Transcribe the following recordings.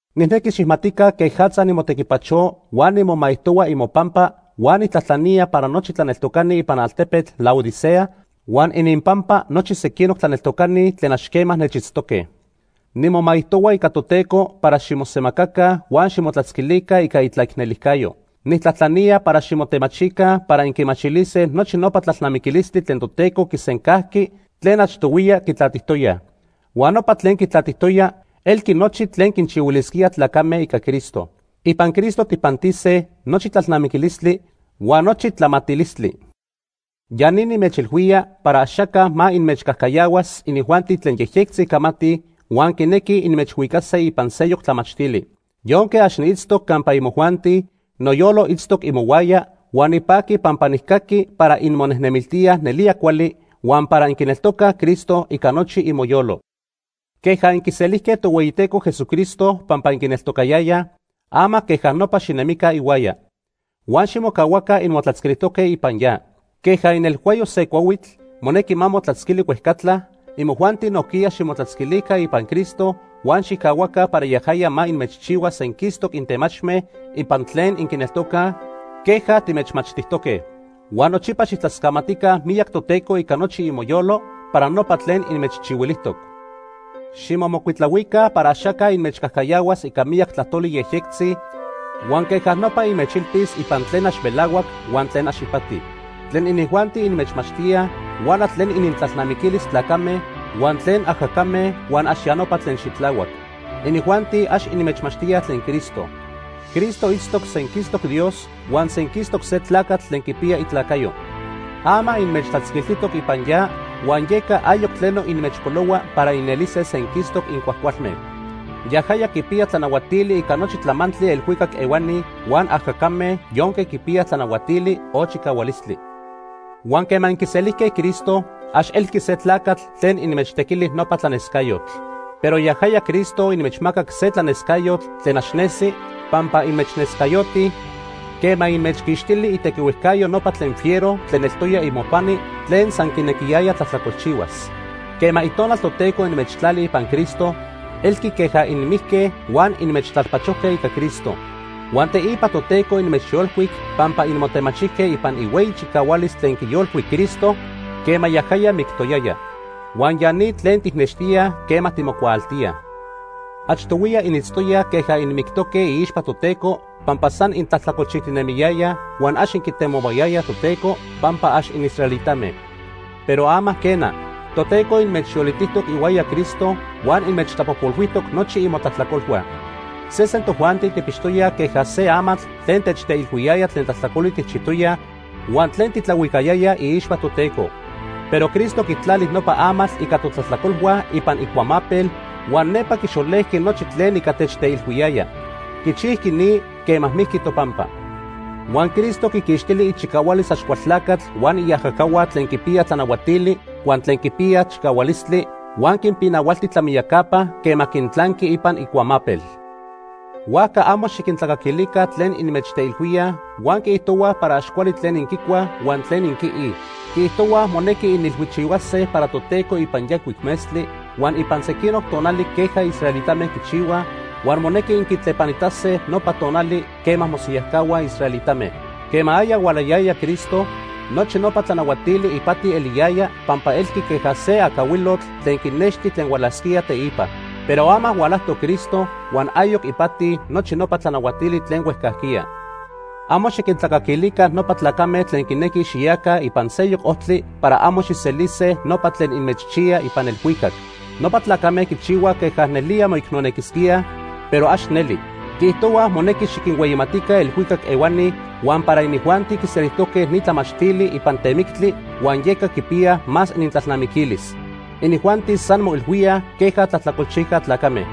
Nijnequi xijmatica quejatza nimotequipacho huan nimomaijtohua imopampa huan nijtlajtlanía para nochi tlaneltocani ipan altepetl Laodicea huan ininpampa nochi sequinoc tlaneltocani tlen ax quema nechitztoque. Nimomaijtohua ica Toteco para ximosemacaca huan ximotlatzquilica ica itlaicnelijcayo. Nijtlajtlanía para ximotemachica para inquimachilise nochi nopa tlalnamiquilistli tlen Toteco quisencajqui tlen achtohuiya quitlatijtoyaj. Huan nopa tlen quitlatijtoya elqui nochi tlen quinchihuilisquía tlacame ica Cristo. Ipan Cristo tijpantise nochi tlalnamiquilistli huan nochi tlamatilistli. Ya ni nimechilhuía para axaca ma inmechcajcayahuas inijuanti tlen yejyectzi camatij huan quinequij inmechhuicase ipan seyoc tlamachtili. Yonque ax niitztoc campa imojuanti, noyolo itztoc imohuaya huan nipaqui pampa nijcaqui para inmonejnemiltíaj nelía cuali huan para inquineltocaj Cristo ica nochi imoyolo. Queja inquiselijque Tohueyiteco Jesucristo pampa inquineltocayayaj, ama queja nopa xinemica ihuaya. Huan ximocahuaca inmotlatzquilijtoque ipan ya. Queja inelhuayo se cuahuitl monequi ma motlatzquili huejcatla, imojuanti nojquiya ximotlatzquilica ipan Cristo huan xijcahuaca para yajaya ma inmechchihua senquistoc intemachme ipan tlen inquineltocaj queja timechmachtijtoque. Huan nochipa xijtlascamatica miyac Toteco ica nochi imoyolo para nopa tlen inmechchihuilijtoc. Ximomocuitlahuica para axaca inmechcajcayahuas ica miyac tlajtoli yejyectzitzi huan queja nopa inmechilpis ipan tlen ax melahuac huan tlen ax ipati. Tlen inijuanti inmechmachtíaj huala tlen inintlalnamiquilis tlacame huan tlen ajacame huan ax ya nopa tlen xitlahuac. Inijuanti ax inmechmachtíaj tlen Cristo. Cristo itztoc senquistoc Dios huan senquistoc se tlacatl tlen quipiya itlacayo. Ama inmechtlatzquiltijtoc ipan ya, huan yeca ayoc tleno inmechpolohua para inelise senquistoc incuajcualme. Yajaya quipiya tlanahuatili ica nochi tlamantli elhuicac ehuani huan ajacame yonque quipiyaj tlanahuatili o chicahualistli. Huan quema inquiselijque Cristo, ax elqui se tlacatl tlen inmechtequili nopa tlanescayotl. Pero yajaya Cristo inmechmacac se tlanescayotl tlen ax nesi, pampa inmechnescayoti quema inmechquixtili itequihuejcayo nopa tlen fiero tlen eltoya imopani tlen san quinequiyaya tlajtlacolchihuas. Quema Itonal Toteco inmechtlali ipan Cristo, elqui queja inmijque huan inmechtlalpachojque ica Cristo. Huan teipa Toteco inmechyolcuic pampa inmotemachijque ipan ihueyi chicahualis tlen quiyolcuic Cristo quema yajaya mictoyaya. Huan ya ni tlen tijnextíaj quema timocuaaltíaj. Achtohuiya initztoyaj queja inmictoque iixpa Toteco pampa san intlajtlacolchijtinemiyayaj huan ax inquitemohuayayaj Toteco pampa ax inisraelitame. Pero ama quena, Toteco inmechyolitijtoc ihuaya Cristo huan inmechtlapojpolhuijtoc nochi imotlajtlacolhua. Sesen tojuanti tijpixtoyaj queja se amatl tlen techteilhuiyaya tlen tlajtlacoli tijchijtoyaj huan tlen titlahuicayaya iixpa Toteco. Pero Cristo quitlali nopa amatl ica totlajtlacolhua ipan icuamapel huan nepa quixolejqui nochi tlen ica techteilhuiyaya. Quichijqui ni quema mijqui topampa. Huan Cristo quiquixtili ichicahualis Axcualtlacatl huan iajacahua tlen quipiyaj tlanahuatili huan tlen quipiyaj chicahualistli huan quinpinahualti tlamiyacapa quema quintlanqui ipan icuamapel. Huajca amo xiquintlacaquilica tlen inmechteilhuíaj huan quiijtohuaj para ax cuali tlen inquicuaj huan tlen inquiij. Quiijtohuaj monequi inilhuichihuase para Toteco ipan yancuic metztli huan ipan sequinoc tonali queja israelitame quichihuaj huan monequi inquitlepanitase nopa tonali quema mosiyajcahuaj israelitame. Quema aya hualayaya Cristo, nochi nopa tlanahuatili ipati eliyaya pampa elqui queja se acahuilotl tlen quinexti tlen hualasquía teipa. Pero ama hualajtoc Cristo, huan ayoc ipati nochi nopa tlanahuatili tlen huejcajquiya. Amo xiquintlacaquilica nopa tlacame tlen quinequij xiyaca ipan seyoc ojtli para amo xijselise nopa tlen inmechchiya ipan elhuicac. Nopa tlacame quichihuaj queja nelía moicnonequisquíaj, pero ax neli. Quiijtohuaj monequi xiquinhueyimatica elhuicac ehuani huan para inijuanti quiselijtoque ni tlamachtili ipan temictli huan yeca quipiyaj más inintlalnamiquilis. Inijuanti san moilhuíaj queja tlajtlacolchijca tlacame.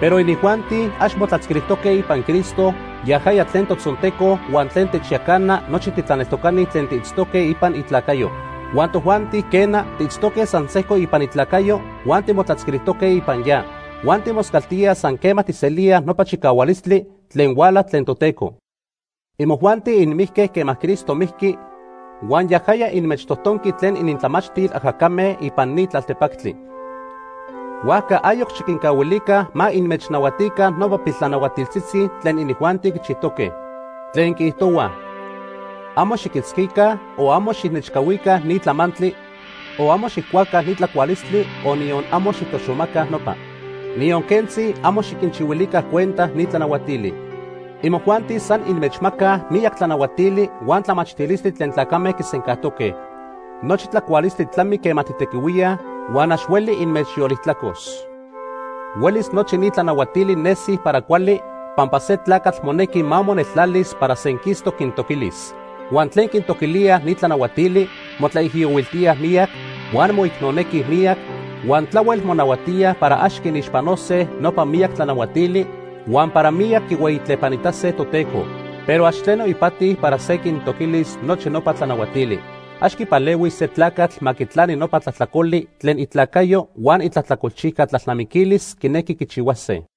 Pero inijuanti ax motlatzquilijtoque ipan Cristo, yajaya tlen totzonteco huan tlen techyacana nochi titlaneltocani tlen tiitztoque ipan itlacayo. Huan tojuanti, quena, tiitztoque san sejco ipan itlacayo huan timotlatzquilijtoque ipan ya. Huan timoscaltíaj san quema tijselíaj nopa chicahualistli tlen huala tlen Toteco. Imojuanti inmijque quema Cristo mijqui, huan yajaya inmechtojtonqui tlen inintlamachtil ajacame ipan ni tlaltepactli. Huajca ayoc xiquincahuilica ma inmechnahuatica nopa piltlanahuatiltzitzi tlen inijuanti quichijtoque, tlen quiijtohuaj: “Amo xiquitzquica o amo xijnechcahuica ni tlamantli, o amo xijcuaca ni tlacualistli, o niyon amo xijtoxomaca nopa.” Niyon quentzi amo xiquinchihuilica cuenta ni tlanahuatili. Imojuanti san inmechmacaj miyac tlanahuatili huan tlamachtilistli tlen tlacame quisencajtoque. Nochi tlacualistli tlami quema tijtequihuíaj huan ax hueli inmechyolijtlacos. Huelis nochi ni tlanahuatili nesij para cuali pampa se tlacatl monequi ma moneltlalis para senquistoc quintoquilis. Huan tlen quintoquilíaj ni tlanahuatili motlaijiyohuiltíaj miyac, huan moicnonequij miyac huan tlahuel monahuatíaj para ax quinixpanose nopa miyac tlanahuatili huan para miyac quihueyitlepanitase Toteco. Pero ax tleno ipati para se quintoquilis nochi nopa tlanahuatili. Ax quipalehuis se tlacatl ma quitlani nopa tlajtlacoli tlen itlacayo huan itlajtlacolchijca tlalnamiquilis quinequi quichihuase.